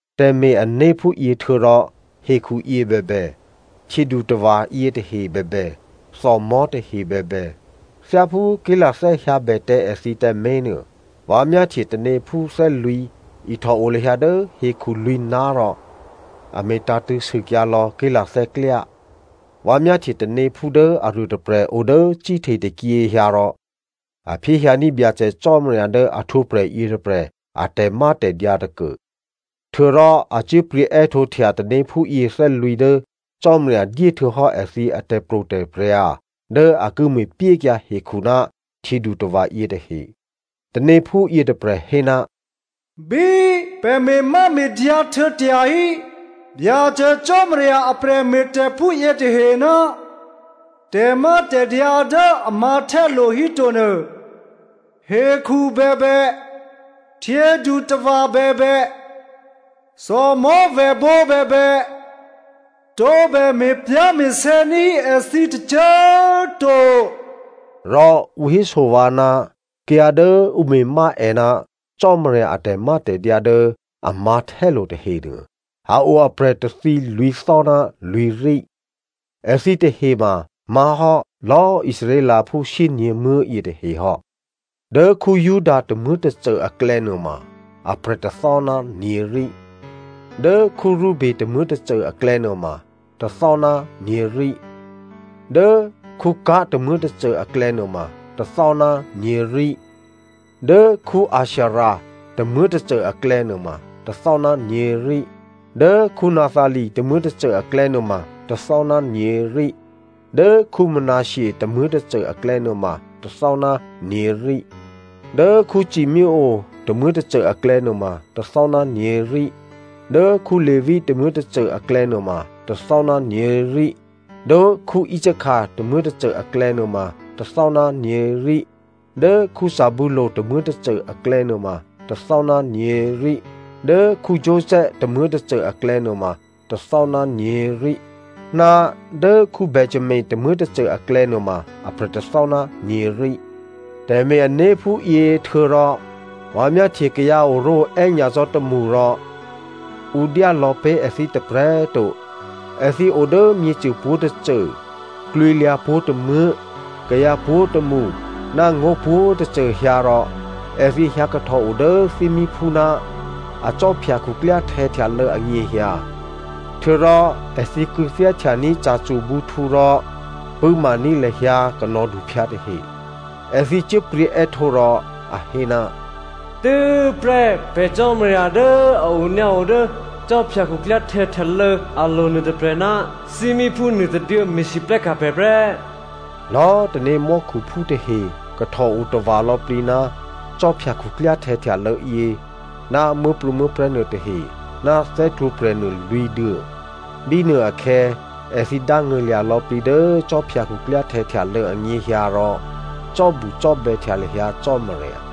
Tè̤me̤-ané̤ phúyě htuô̌rò hekhuyě bèbè, htyědutava̤ yětahe bèbè, thòmò̤́ tahe bèbè, thyáphú ké̤lathè́ hyǎbè tǎ èthǐ tǎmé̤ nuô, vǎ myáhtye tanéphú thè́lwǐ̤ ihtòo lahyǎ dố hekhu lwǐ̤ná̤ rò a me̤tǎ̤tṳ̂̌ sûkyǎlò̌ ké̤lathè́ klyá. Vǎ myáhtye tanéphú dố aruôtôprè̤ o dố cíhte tôkyě hyǎ rò a phyéhyǎní̤ Byacè Cò́marya dố a htwǒprè̤ yětôprè̤ a tè̤mátè̤dyǎ tôkuô. Htuô̌rò a cyé̤pryě̤ è́htǒhtya tanéphú yěthè́lwǐ̤ dố Cò́marya dyé htuô̌hò́ èthǐ atè̤pro̤tè̤prya̤dố a ki me̤pyékyǎ hekhu ná htyědutava̤ yětahe. Tanéphú yětôprè̤ hé, “Bí pè̤ me̤máme̤dyǎ htuô̌ tyahí Byacè Cò́marya a prè̤me̤tè̤phú yětahe ná tè̤mátè̤dyǎ dố a mǎ̤htè́lo̤ híto nuô, hekhu bèbè, htyědutava̤ bèbè, thòmò̤́vèbǒ bèbè, tǒbè me̤pyá̤me̤sè̌ ní̤hí èthǐ tôcô꤮ to.” Rò ǔ héso vǎ ná kayǎ dố ǔ me̤má è ná Cò́marya a tè̤mátè̤dyǎ dố a mǎ̤htè́lo̤ tahenuô, a o aprè̤ tôthǐ lwǐ̤thò́ ná lwǐ̤rí. Èthǐ tahe ma má̤hò́ lò̌ Israelphú shyényě̤muố̤ yětahe hò́. Dố Juda tômuố̤tôcô aklè̌ nuôma aprè̤ tôthò́ ná nyě̤rí, Dố Reube tômuố̤tôcô aklè̌ nuôma tôthò́ ná nyě̤rí, Dố Gad tômuố̤tôcô aklè̌ nuôma tôthò́ ná nyě̤rí, Dố Asher tômuố̤tôcô aklè̌ nuôma tôthò́ ná nyě̤rí, Dố Naphtali tômuố̤tôcô aklè̌ nuôma tôthò́ ná nyě̤rí, Dố Manasseh tômuố̤tôcô aklè̌ nuôma tôthò́ ná nyě̤rí, Dố Simeonè tômuố̤tôcô aklè̌ nuôma tôthò́ ná nyě̤rí, Dố Levi tômuố̤tôcô aklè̌ nuôma tôthò́ ná nyě̤rí, Dố Isachar tômuố̤tôcô aklè̌ nuôma tôthò́ ná nyě̤rí, Dố Zebulu tômuố̤tôcô aklè̌ nuôma tôthò́ ná nyě̤rí, Dố Joseph tômuố̤tôcô aklè̌ nuôma tôthò́ ná nyě̤rí Ná dố Benjamino tômuố̤tôcô aklè̌ nuôma aprè̤ tôthò́ ná nyě̤rí. Tè̤me̤-ané̤ phúyě htuô̌rò vǎ myáhtye kayǎ oró̤oè́ nyacò́ tômṳ rò ǔ dyá lò̌pé̤ èthǐ tôprè̤꤮ to. Èthǐ o dố myěcô pwǒ̤tôcô, klwǐlyǎ pwǒ̤tômuố̤, kayǎ pwǒ̤tômṳ, ná ngó̤ pwǒ̤꤮ tôcô hyǎ rò èthǐ hyǎkahtòo dố thímíphú ná akhwí khuklyáhtè̌ htyalô̌ anyěhyǎ. Htuô̌rò èthǐ kû̌thyáhtyaní̤ ca̤cwo̤bǔhtǔ rò pṳ̂́maní̤ lahyǎ kanò̌duphyǎ tahe. Èthǐ cyé̤pryě̤ è́htǒ rò a hé, “Tû́prè́ pè̤ Cò́marya dố a onyǎo dố khwí khuklyáhtè̌ htyalô̌ alo̤ nuô tôprè̤ ná thímíphú nuôtôduô̌ me̤lwóhteka̤ pè̤ prè́.” Lò̌꤮ tanémò́khuphú tahe kahtòo tava̤ lò̌plǐ ná khwí khuklyáhtè̌ htyalô̌ yě ná muố̤prû̌muố̤prè̤́ nuôtahe ná thè́htwǒprè̤ nuô lwǐ̤duô̌. Bínuôakhè̌ èthǐ dángṳ̂lya̤ lò̌plǐ dố khwí khuklyáhtè̌ htyalô̌ anyěhyǎ rò cò́bucò́bè̌htya lahyǎ Cò́marya.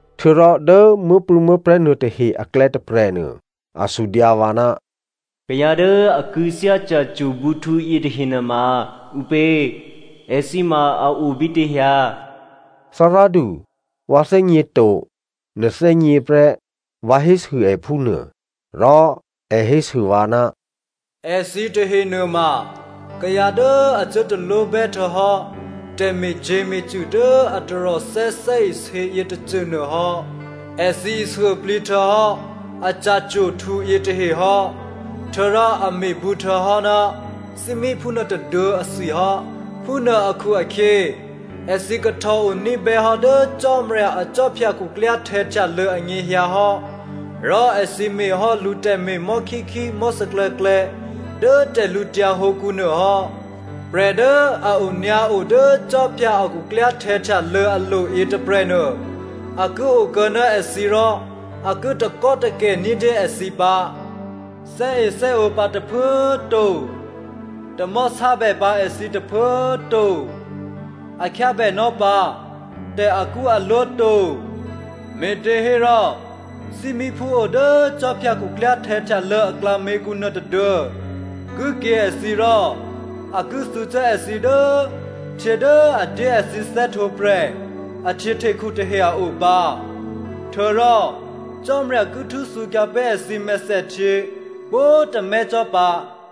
Htuô̌rò dố muố̤prû̌muố̤prè̤́ nuôtahe aklè̌ tôprè̤nuô a sudyǎ vǎ, “Kayǎ dố a kû̌thyá ca̤cwo̤bǔhtǔ yětahe nuôma ǔpě? Èthǐ ma a o bítě hyǎ?” “Thárádu, vǎ thè́gněto, nè̤ thè́gně prè́,” vǎ hésû è phúnuô. Rò è hésû vǎ, “Èthǐ tahe nuôma kayǎ dố a cuố talwóbè́ htuô̌hò́ tè̤me̤cyě̤me̤cṳ̂ dố a taròthè́ thè́isě yětôcônuô hò́. Èthǐ ishuôplǐ htuô̌hò́ a ca̤cwo̤htǔ yětahe hò́, htuô̌rò a me̤bǔ htuô̌hò́ ná thímíphú nuôtôduô̌ athwi hò́. Phúnuô akhu-akhyě, Èthǐ kahtòo ní̤bè́hò́ dố Cò́marya akhwí khuklyáhtè̌ htyalô̌ anyěhyǎ hò́ rò èthǐ me̤ hò́ lǔ tè̤me̤ mò̤́khíkhí, mò̤́sè̌klè̌klè̌ dố tè̤lǔtyǎ hǒkǔ nuô hò́. Prè̤ dố a onyǎo dố khwí a khuklyáhtè̌ htyalô̌ alo̤ yětôprè̤nuô, a ki okuô̌ ná èthǐ rò a ki takò́takè̤ ní̤dyé èthǐ pǎ. Thè́ethè́ǒ pǎ tôphuố꤮ to. Tamò̤́ sábè pǎ èthǐ tôphuố꤮ to. A khyábènò́ pǎ tè̤akṳ́alwó to. Me̤těhérò thímíphú o dố khwí khuklyáhtè̌ htyalô̌ aklǎměkǔ nuôtôduô̌ ki kyě̤ èthǐ rò a ki thǔcuố èthǐ dố htyě dố a dyé èthǐ thè́htwǒprè̤ a htyěhtekhu tahe a o pǎ. Htuô̌rò Cò́marya ki htû́thǔkyǎ pé̤ èthǐ mèthèhtyě pwǒ̤tômè́ cò́ pǎ.”